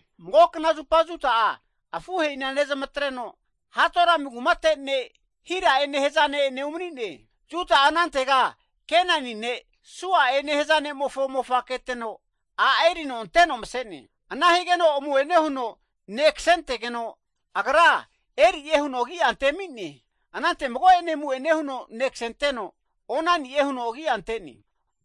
Mago zupa Juda'a afuhe'ina nezamatreno Adulami kumate ne' Hira'e nehaza ne'ene umani'ne. Juda'a anantega Kenani ne' Sua'e nehaza ne'mofo mofa keteno, a' erino anteno mase'ne. Ana higeno amu'ene huno ne' kasentegeno, agra Eri'e huno agi'a antemi'ne. Anante mago'ene amu'ene huno ne' kasenteno, Onani'e huno agi'a ante'ne.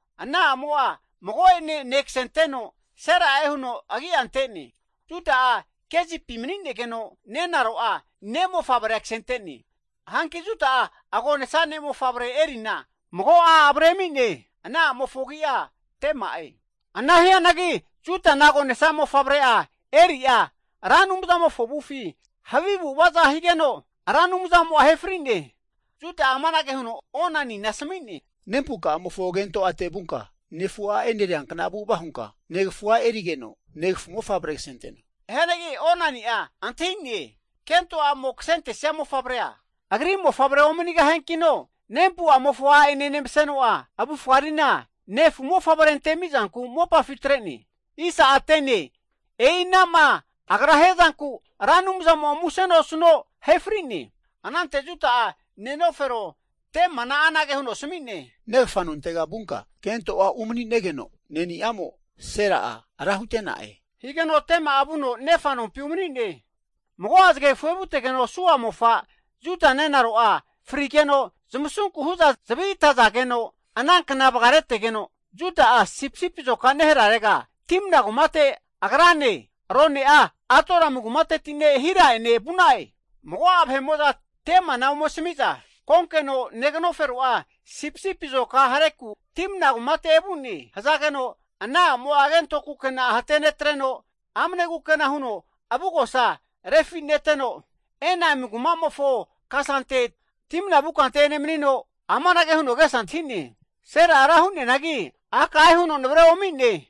Ana a'mo'a mago'ene ne' kasenteno Sela'e huno agi'a ante'ne. Juda'a Kezipi mani'negeno nenaro'a ne'mofavrea kase ante'ne. Hanki Juda'a agonesa ne'mofavre'a Erina mago a' avre ami'ne. Ana a'mofo agi'a Tema'e. Ana hianagi Judana agonesa mofavre'a Eri'a Ra Anumza'mofo avufi havi avu'avaza higeno, Ra Anumzamo'a ahe fri'ne. Juda'a amanage huno Onanina asami'ne, Nempuka'amofo kento ate vunka, nefu a' eneriankna avu'ava hunka, negafu a' erigeno, negafu mofavre kasenteno. Hianagi Onani'a antahi'ne, kento a'mo kasentesia mofavrea agri mofavre omanigahiankino, nempu'amofo a' ene nemaseno'a avufga rina, nefu mofavre antemi'zanku mopafi atre'ne. E'inama agra hiazanku Ra Anumzamo'a musena osuno, ahe fri'ne. Anante Juda'a nenofero Temana anage huno asmi'ne, Negafa nontega vunka kento a' umani'negeno, ne'niamo Sela'a ra hute'na'e. Higeno Tema'a vuno nefa nompi umani'ne. Mago'a zagegafu evutegeno Sua mofa, Juda nenaro'a frigeno, zamasunku hu'za zavi atazageno ana kna vagaretegeno, Juda'a sipisipi azoka neharerega Timna kumate agrane, arone'a Adulamu kumateti ne' Hira'ene vu'na'e. Mago'a vahe'mo'za Temana ome asami'za, Konkeno negnofero'a sipisipi'a azoka hareku Timna kumate evu'ne. Hazageno ana a'mo kento kukena hate netreno amne kukena huno, avugosa refineteno, Enaim kuma'mofo kasante Timna vu kante emani'neno, amanage huno agesa antahine, Sela'a hago ra hu'neanagi, a' ka'e huno navre omi'ne.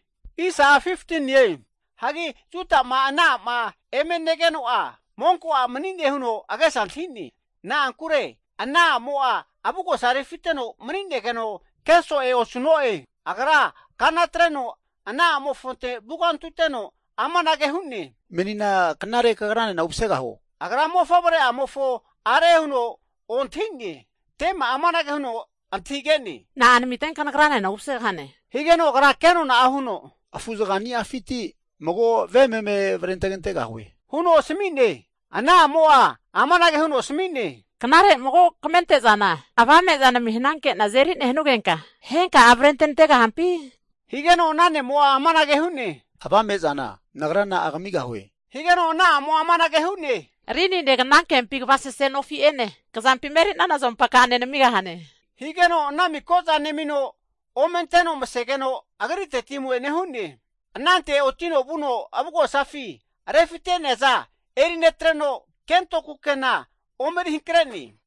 Hagi Juda'ma ana a'ma eme negeno'a, monko a' mani'ne huno agesa antahi'ne. Na'ankure ana a'mo'a avugosa refiteno mani'negeno keso'e osu'ne. Agra kana atreno ana a'mofonte vugantuteno amanage hu'ne, Menina knare kagranena umasegahuo? Agra mofavre'amofo are huno ontahi'ne. Tema'a amanage huno antahige'ne, Na'a namitenka nagra'nena umasegahane? Higeno agra kenona'a huno, Afuzaga ni'afinti mago ve meme avrentegantegahue huno asmi'ne. Ana a'mo'a amanage huno asmi'ne, Knare mago kamente'zana avame'za naminanke'na azeri nenugenka, henka'a avrente nantegahampi? Higeno ana ne'mo'a amanage hu'ne. Avame'zana nagra na'a kamigahue? Higeno ana a'mo'a anage hu'ne, rinine, knankempi kvasese nofi'ene, kazampima eri'nana azompa ka'ane namigahane. Higeno ana miko'za nemino ome anteno masegeno agriteti amu'ene hu'ne. Anante otino vuno avugosafi refite'neaza eri netreno, kento kukena omeri hankre'ne.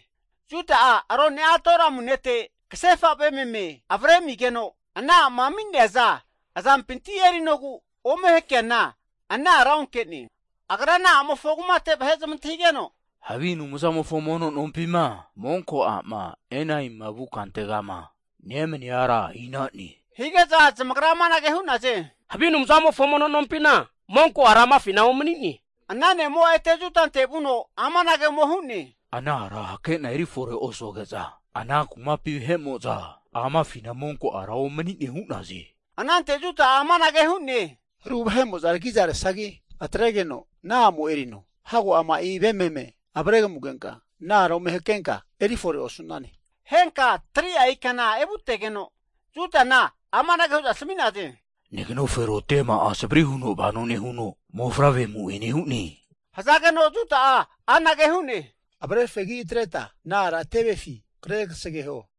Juda'a rone'a Adulami ne'te, kasefa ve meme avre amigeno ana a'ma ami'neaza azampinti erinogu ome hakeana ana ara onke'ne. Agra ana a'mofo kumate vahe zamantahigeno, Havi anumzamofo mono nompima monko a'ma Enaimima vu kantegama nemania ara ina'ne? Hige'za zamagra amanage hu'naze, Havi anumzamofo mono nompina, monko ara amafina omani'ne. Ana ne'mo'a ete Judante vuno, amanage ome hu'ne, ana ara hake'na erifore osuge'za, ana kumapi vahe'mo'za amafina monko ara omani'ne hu'naze. Anante Juda'a amanage hu'ne, Aru vahe'mo'za tagiza resagi atregeno ana a'mo erino. Hago ama'i ve meme avre kamugenka, ana ara ome hakenka eri fore osane. Henka 3'a ikana evutegeno, Judana amanage hu'za asami'naze, neganofero Tema'a savri huno vano nehuno mofavre amu'ene hu'ne. Hazageno Juda'a anage hu'ne, Avre fegi atreta ana ara tevefi kre kasegeho!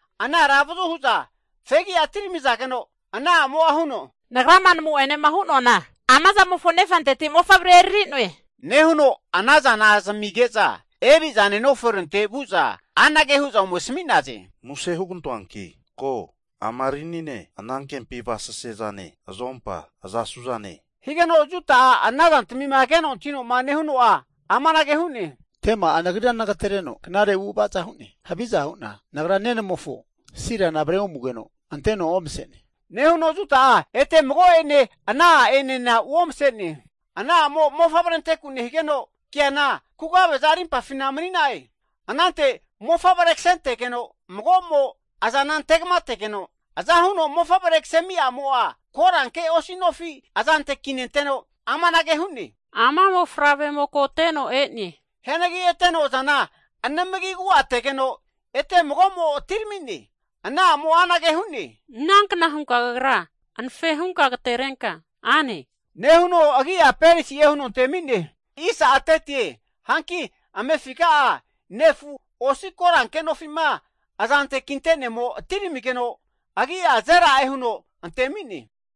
Ana ara avazu hu'za fegi'a atirmizageno, ana a'mo'a huno, Nagrama namu'ene hu'noana ama zamofo nefanteti mofavrea eriri'noe. Nehuno ana zana zamige'za eri'za nenoferonte vu'za anage hu'za ome asami'naze, muse (plis) hugantoanki ko, ama rinine, anankempi avasese'zane, azompa aza suzane? Higeno Juda'a ana zantmima keno antahino'ma nehuno'a amanage hu'ne, Tema'a nagrira nagatereno knare avu'avaza hu'ne. Haviza hu'na nagra nenamofo Selana avre omugeno anteno omase'ne. Nehuno Juda'a ete mago'ene ana a'enena uomase'ne. Ana a'mo mofavre anteku nehigeno, keana kugave'za rimpafina mani'na'e. Anante mofavre kasenentegeno mago'mo azana ante kamategeno, aza huno mofavre kasemi a'mo'a koranke osi nofi azante kinenteno, amanage hu'ne, Ama mofavremo koteno e'ne. Hianagi eteno azana anamagi agu'ategeno, ete mago'mo atiramine. Ana a'mo'a anage hu'ne, Inankna hunka kagra anafe hunka agaterenka ane, nehuno agi'a Peresi'e huno antemi'ne. Hanki amefiga'a nefu osi koranke nofi'ma azante kinte'nemo atiramigeno, agi'a Zela'e huno antemi'ne.